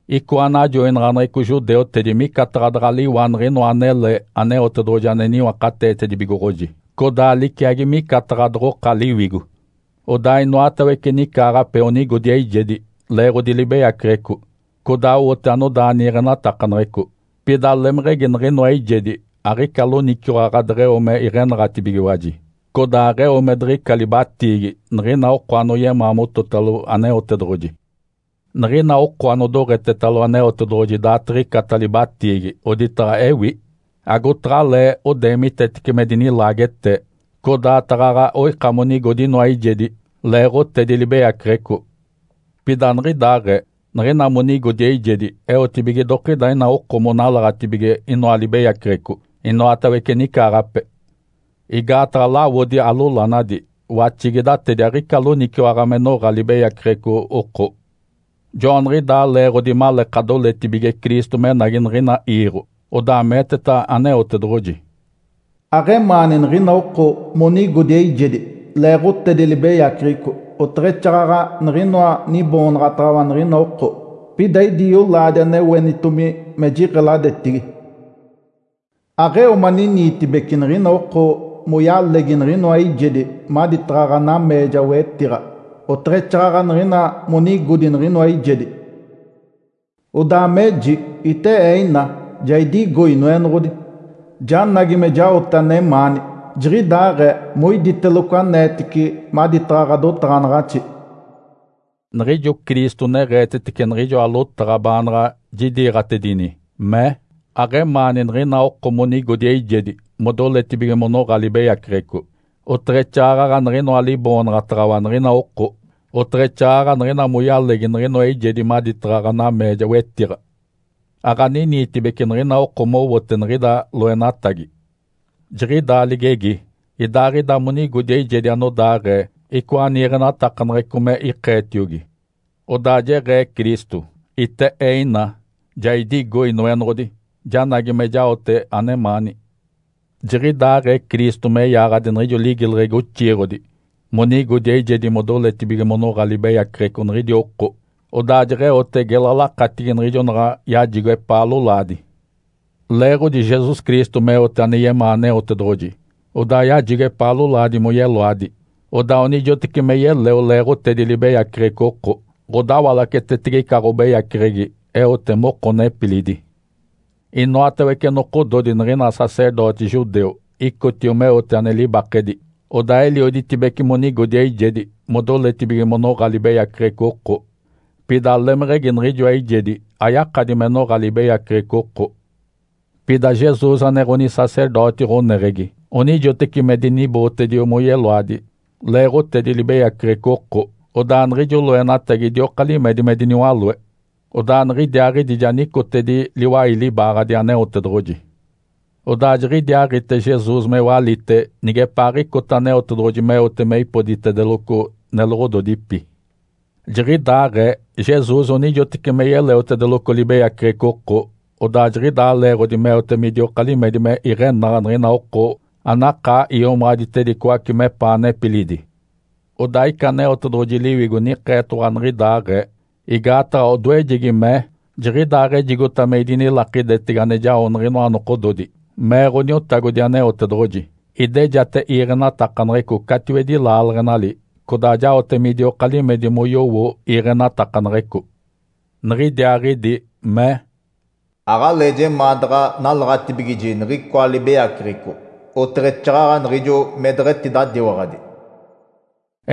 Icoa najoinaɡ̶aneɡ̶eco judeutedi micataɡ̶a daɡ̶a liwa niɡ̶inoa anele Aneotedoɡ̶oji ane niwakateetedibigoɡ̶oji, codaa aliciagi micataɡ̶a doɡ̶oka liwigo. Odaa inoatawece nicaaɡ̶ape onigodi eijedi leeɡ̶odi libeyaceɡ̶eco, codaa owote anodaa niiɡ̶enatakaneɡ̶eco. Pida lemeɡ̶egi niɡ̶inoa eijedi aɡ̶ica loniciwaɡ̶a deɡ̶eo me iɡ̶enaɡ̶atibigiwaji, codaa aɡ̶eo me diɡ̶ica libatiigi, niɡ̶ina oko anoyemaa mototalo Aneotedoɡ̶oji. Niɡ̶ina oko anodoɡ̶etetalo Aneotedoɡ̶oji daaditiɡ̶icata libatiigi oditaɡ̶a ewi, agotaɡ̶alee odeemitetece me dinilaagetee, codaa taɡ̶aɡ̶a oika monigodi inoa eijedi leeɡ̶otedi libeyaceɡ̶eco. Pida aniɡ̶idaaɡ̶ee. Niɡ̶ina monigodi eijedi, eotibige idokida ina oko monalaɡ̶atibige inoa libeyaceɡ̶eco inoatawece nicaaɡ̶ape. Igaataɡ̶a lawodi alolanadi, waxigidatedi aɡ̶ica loniciwaɡ̶a me noɡ̶a libeyaceɡ̶eco oko. Joaniɡ̶idaa leeɡ̶odi maleeka doletibige Cristo menagi niɡ̶ina iiɡ̶o, odaa meeteta Aneotedoɡ̶oji, “Aɡ̶emaani niɡ̶ina oko monigodi eijedi leeɡ̶otedi libeyaceɡ̶eco oteɡ̶exaaɡ̶aɡ̶a niɡ̶inoa niboonaɡ̶ataɡ̶awa niɡ̶ina oko. Pida idi yolaadi ane oenitomi me jiɡ̶eladetigi. Aɡ̶eo maniniitibeci niɡ̶ina oko moyalegi niɡ̶inoa eijedi maditaɡ̶a ɡ̶anameeja wetiɡ̶a, oteɡ̶exaaɡ̶aɡ̶a niɡ̶ina monigodi niɡ̶inoa eijedi. Odaa meji, ‘Ite Ee ina, ja idigo, Inoenoɡ̶odi, janagi me jaote anemaani. Jiɡ̶idaaɡ̶ee moiditeloco aneetici maditaɡ̶a ɡ̶adotaɡ̶anaɡ̶axi.’” Niɡ̶ijo Cristo neɡ̶eetetece niɡ̶ijoa lotaɡ̶a baanaɡ̶a jidiiɡ̶atedini, mee, “Aɡ̶emaani niɡ̶ina oko monigodi eijedi modoletibige monoɡ̶a libeyaceɡ̶eco, oteɡ̶exaaɡ̶aɡ̶a niɡ̶inoa liboonaɡ̶ataɡ̶awa niɡ̶ina oko, oteɡ̶exaaɡ̶aɡ̶a niɡ̶ina moyalegi niɡ̶inoa eijedi maditaɡ̶a ɡ̶anameeja wetiɡ̶a. Aɡ̶aniniitibeci niɡ̶ina oko mowote niɡ̶ida loenatagi.” Jiɡ̶idaa ligegi, idaaɡ̶ida monigodi eijedi anodaaɡ̶ee icoa niiɡ̶enatakaneɡ̶eco me ikeetiogi. Odaa jeɡ̶ee Cristo, “Ite Ee ina, ja idigo, Inoenoɡ̶odi. Janagi me jaote anemaani.” Jiɡ̶idaaɡ̶ee Cristo me yaaɡ̶adi niɡ̶ijo ligileɡ̶egi oxiiɡ̶odi monigodi eijedi modoletibige monoɡ̶a libeyaceɡ̶eco niɡ̶idi oko, odaa jeɡ̶eote gela lakatigi niɡ̶ijo naɡ̶a yajigo epaa lolaadi. Leeɡ̶odi Jesus Cristo meote ane yemaa Aneotedoɡ̶oji, odaa yajigo epaa lolaadi moyeloadi, odaa onijoteci me yeleo leeɡ̶otedi libeyaceɡ̶eco oko, ɡ̶odawalacetetege ica ɡ̶obeyaceɡ̶egi eote moko nepilidi. Inoatawece nokododi niɡ̶ina sacerdoti judeu icotio meote ane libakedi, odaa elioditibece monigodi eijedi modoletibige monoɡ̶a libeyaceɡ̶eco oko. Pida lemeɡ̶egi niɡ̶ijoa eijedi ayakadi me noɡ̶a libeyaceɡ̶eco oko. Pida Jesus, ane Ǥonisacerdoti ɡ̶oneɡ̶egi, onijoteci me dinibootedio moyeloadi leeɡ̶otedi libeyaceɡ̶eco oko, odaa niɡ̶ijo loenatagi idioka limedi me diniwaloe. Odaa niɡ̶idiaaɡ̶idi ja nicotedi liwai libaaɡ̶adi Aneotedoɡ̶oji. Odaa jiɡ̶idiaaɡ̶ite Jesus me walite nigepaaɡ̶icota Aneotedoɡ̶oji meote me ipoditedeloco neloɡ̶ododipi. Jiɡ̶idaaɡ̶ee Jesus onijoteci me yeleotedeloco libeyaceɡ̶eco oko, odaa jiɡ̶idaa leeɡ̶odi meote midioka limedi me iɡ̶enaɡ̶a niɡ̶ina oko anakaa iomaɡ̶aditedicoace mepaa nepilidi. Odaa ica Aneotedoɡ̶oji Liwigo nikeetoɡ̶owa niɡ̶idaaɡ̶ee. Igaataɡ̶a odoejegi mee, “‘Jiɡ̶idaaɡ̶ejigota me idinilakidetege ane jao niɡ̶inoa nokododi,’ mee Ǥoniotagodi Aneotedoɡ̶oji, ‘Idejate iiɡ̶enatakaneɡ̶eco catiwedi laaleɡ̶enali, codaa jaote midioka limedi moyowo iiɡ̶enatakaneɡ̶eco.’” Niɡ̶idiaaɡ̶idi mee, “Aɡ̶alee jemaa daɡ̶a nalaɡ̶atibigiji niɡ̶icoa libeyaceɡ̶eco, oteɡ̶exaaɡ̶aɡ̶a niɡ̶ijo me deɡ̶etidadiwaɡ̶adi.”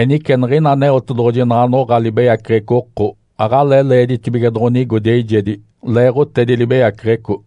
Enice niɡ̶ina Aneotedoɡ̶oji naɡ̶a noɡ̶a libeyaceɡ̶eco oko, aɡ̶alee leeditibige doɡ̶onigodi eijedi leeɡ̶otedi libeyaceɡ̶eco.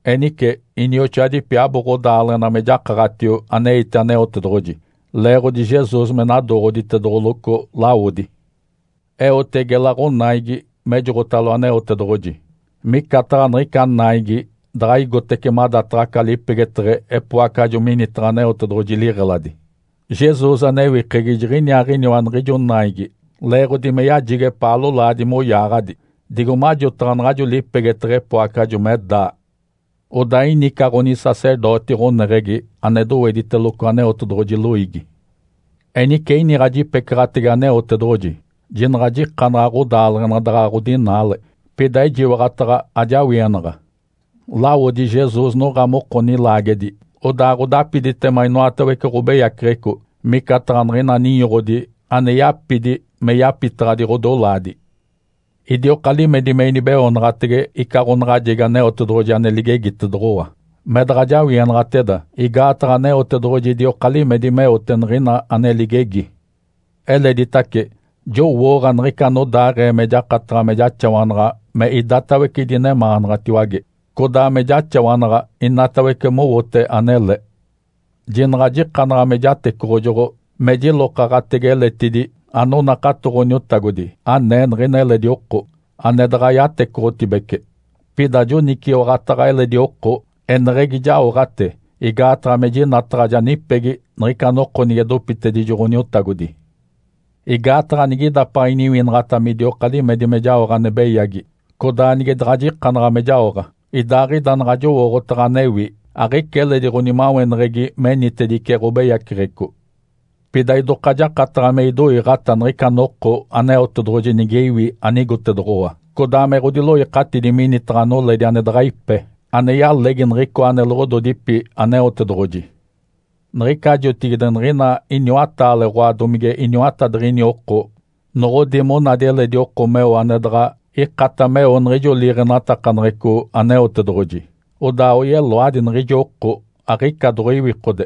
Enice, inioxoadipi, abo ɡ̶odaaleɡ̶ena me jakaɡ̶atio aneite Aneotedoɡ̶oji leeɡ̶odi Jesus me nadooɡ̶oditedoɡ̶oloco lawodi. Eote gela ɡ̶onaigi mejoɡ̶otalo Aneotedoɡ̶oji. Micataɡ̶a niɡ̶ica naigi daɡ̶a igotece madataɡ̶a aca lipegeteɡ̶e epoacajo minitaɡ̶a Aneotedoɡ̶oji liɡ̶eladi. Jesus, anewikegi, jiɡ̶iniaaɡ̶iniwa niɡ̶ijo naigi leeɡ̶odi me yajigo epaa lolaadi moyaaɡ̶adi, digo majotaɡ̶a naɡ̶ajo lipegeteɡ̶e epoacajo me daa. Odaa ini ica ɡ̶onisacerdoti ɡ̶oneɡ̶egi ane dowediteloco Aneotedoɡ̶oji loiigi. Enice iniɡ̶a jipecaɡ̶atege Aneotedoɡ̶oji, jinaɡ̶a jikanaɡ̶a ɡ̶odaaleɡ̶ena daɡ̶a ɡ̶odinaale, pida ejiwaɡ̶ataɡ̶a ajawienaɡ̶a. Lawodi Jesus noɡ̶a moko nilaagedi, odaa ɡ̶odapiditema inoatawece ɡ̶obeyaceɡ̶eco, micataɡ̶a niɡ̶ina ninyoɡ̶odi ane yapidi me yapitaɡ̶adi ɡ̶odolaadi. Idioka limedi me inibeoonaɡ̶atege ica ɡ̶onaɡ̶ajegi Aneotedoɡ̶oji ane ligegitedoɡ̶owa, me daɡ̶a jawienaɡ̶ateda, igaataɡ̶a Aneotedoɡ̶oji idioka limedi meote niɡ̶ina ane ligegi. Eleditace, jowooɡ̶a niɡ̶ica anodaaɡ̶ee me jakataɡ̶a me jaxawanaɡ̶a me idatawece idinemaanaɡ̶atiwage, codaa me jaxawanaɡ̶a inatawece mowote anele. Jinaɡ̶a jikanaɡ̶a me jatecoɡ̶ojoɡ̶o me jilokaɡ̶atege eletidi anonakato Ǥoniotagodi anee niɡ̶ina eledi oko, ane daɡ̶a yatecoɡ̶otibece. Pida joniciwaɡ̶ataɡ̶a eledi oko, eneɡ̶egi jaoɡ̶ate igaataɡ̶a me jinataɡ̶a ja nipegi niɡ̶ica noko nige dopitedijo Ǥoniotagodi. Igaataɡ̶a nigidapaɡ̶a iniwinaɡ̶ata midioka limedi me jaoɡ̶a ane beyagi, codaa nige daɡ̶a jikanaɡ̶a me jaoɡ̶a, idaaɡ̶ida naɡ̶a jowooɡ̶otaɡ̶a anewi, aɡ̶ica eledi ɡ̶onimaweneɡ̶egi menitedice ɡ̶obeyaceɡ̶eco. Pida idoka jakataɡ̶a me idoiiɡ̶ata niɡ̶ica noko Aneotedoɡ̶oji nige iwi anigotedoɡ̶owa, codaa me ɡ̶odiloikatidi minitaɡ̶a noledi ane daɡ̶a ipe, ane yalegi niɡ̶icoa neloɡ̶ododipi Aneotedoɡ̶oji. Niɡ̶ica jotigide niɡ̶ina iniwataale oɡ̶oa domige iniwatadiɡ̶ini oko noɡ̶odi monadi eledi oko meo ane daɡ̶a ikata meo niɡ̶ijo liiɡ̶enatakaneɡ̶eco Aneotedoɡ̶oji, odaa oyeloadi niɡ̶ijo oko, aɡ̶ica doɡ̶oiwikode.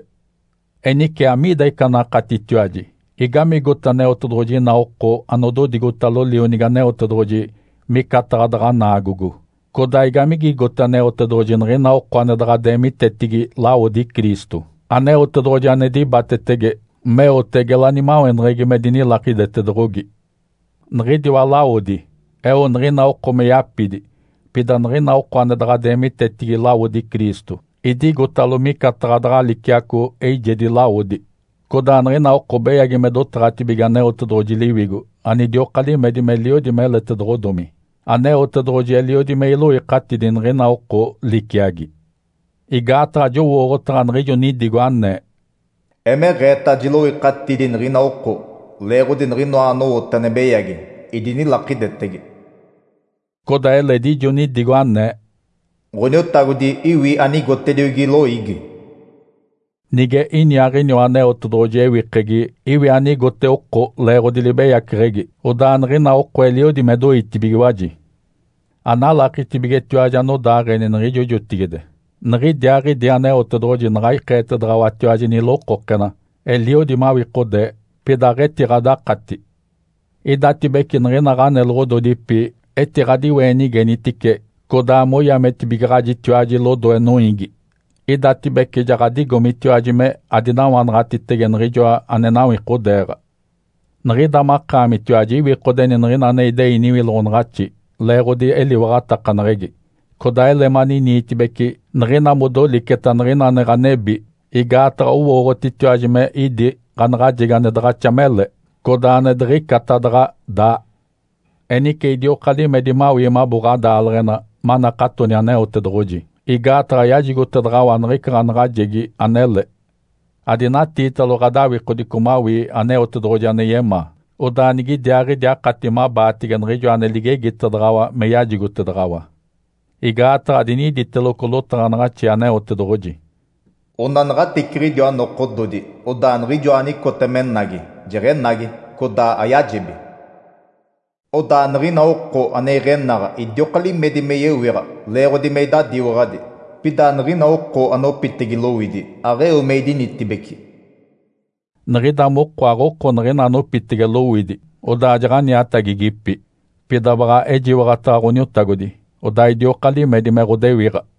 Enice amiida ica anakatitiwaji? Igamigote Aneotedoɡ̶oji ina oko anododigotalo Lionigi Aneotedoɡ̶oji micataɡ̶a daɡ̶a naagogo, codaa igamigigote Aneotedoɡ̶oji niɡ̶ina oko ane daɡ̶a deemitetigi lawodi Cristo, Aneotedoɡ̶oji ane dibatetege, meote gela nimaweneɡ̶egi me dinilakidetedoɡ̶ogi? Niɡ̶idiwa lawodi eo niɡ̶ina oko me yapidi, pida niɡ̶ina oko ane daɡ̶a deemitetigi lawodi Cristo idigotalo micataɡ̶a daɡ̶a liciaco eijedi lawodi. Codaa niɡ̶ina oko beyagi me dotaɡ̶atibige Aneotedoɡ̶oji Liwigo anidioka limedi meliodi meletedoɡ̶odomi. Aneotedoɡ̶oji eliodi me iloikatidi niɡ̶ina oko liciagi. Igaataɡ̶a jowooɡ̶otaɡ̶a niɡ̶ijo nidigo anee, “Emeɡ̶eeta jiloikatidi niɡ̶ina oko leeɡ̶odi niɡ̶inoa anowote ane beyagi, idinilakidetege.” Codaa eledi ijo nidigo anee, “Ǥoniotagodi iwi anigotediogi loiigi.” Nige iniaaɡ̶iniwa Aneotedoɡ̶oji ewikegi iwi anigote oko leeɡ̶odi libeyaceɡ̶egi, odaa niɡ̶ina oko eliodi me doitibigiwaji. Analakitibigetiwaji anodaaɡ̶eni niɡ̶ijo jotigide. Niɡ̶idiaaɡ̶idi Aneotedoɡ̶oji naɡ̶a ikeetedaɡ̶awatiwaji nilokokena, eliodi mawikodee, pida aɡ̶etiɡ̶adakati. Idatibece niɡ̶ina ɡ̶aneloɡ̶ododipi etiɡ̶adiweenigenitice codaa moyametibigaɡ̶ajitiwaji lodoe noiigi. Idatibece ja ɡ̶adigomitiwaji me adinawanaɡ̶atitege niɡ̶ijoa ane nawikodeeɡ̶a. Niɡ̶ida makaamitiwaji iwikodeni niɡ̶ina ane idei niwiloɡ̶onaɡ̶axi leeɡ̶odi eliwaɡ̶atakaneɡ̶egi, codaa ele maniniitibeci niɡ̶ina modoliceta niɡ̶ina ane ɡ̶anebi, igaataɡ̶a owooɡ̶otitiwaji me idi ɡ̶anaɡ̶ajegi ane daɡ̶axa mele, codaa ane diɡ̶icata daɡ̶a daa. Enice idioka limedi mawii mabo ɡ̶adaaleɡ̶ena manakatoni Aneotedoɡ̶oji, igaataɡ̶a yajigotedaɡ̶awa niɡ̶ica ɡ̶anaɡ̶ajegi anele. Adinatiitalo mawii ɡ̶adawikodico Aneotedoɡ̶oji ane yemaa, odaa nigidiaaɡ̶idi akati mabaatege niɡ̶ijo ane ligegitedaɡ̶awa me yajigotedaɡ̶awa. Igaataɡ̶a diniditeloco lotaɡ̶anaɡ̶axi Aneotedoɡ̶oji, “Onanaɡ̶ateciɡ̶idiwa nokododi, odaa Niɡ̶ijoa anicota menagi, jeɡ̶enagi, codaa ayajebi. Odaa niɡ̶ina oko ane iɡ̶enaɡ̶a idioka limedi me yewiɡ̶a leeɡ̶odi me idadiwaɡ̶adi. Pida niɡ̶ina oko anopitege lowidi, aɡ̶eo me idinitibeci.” Niɡ̶ida moko aɡ̶oko niɡ̶ina anopitege lowidi, odaa jaɡ̶aniatagigipi. Pida baɡ̶a ejiwaɡ̶ataɡ̶a Ǥoniotagodi, odaa idioka limedi me ɡ̶odewiɡ̶a.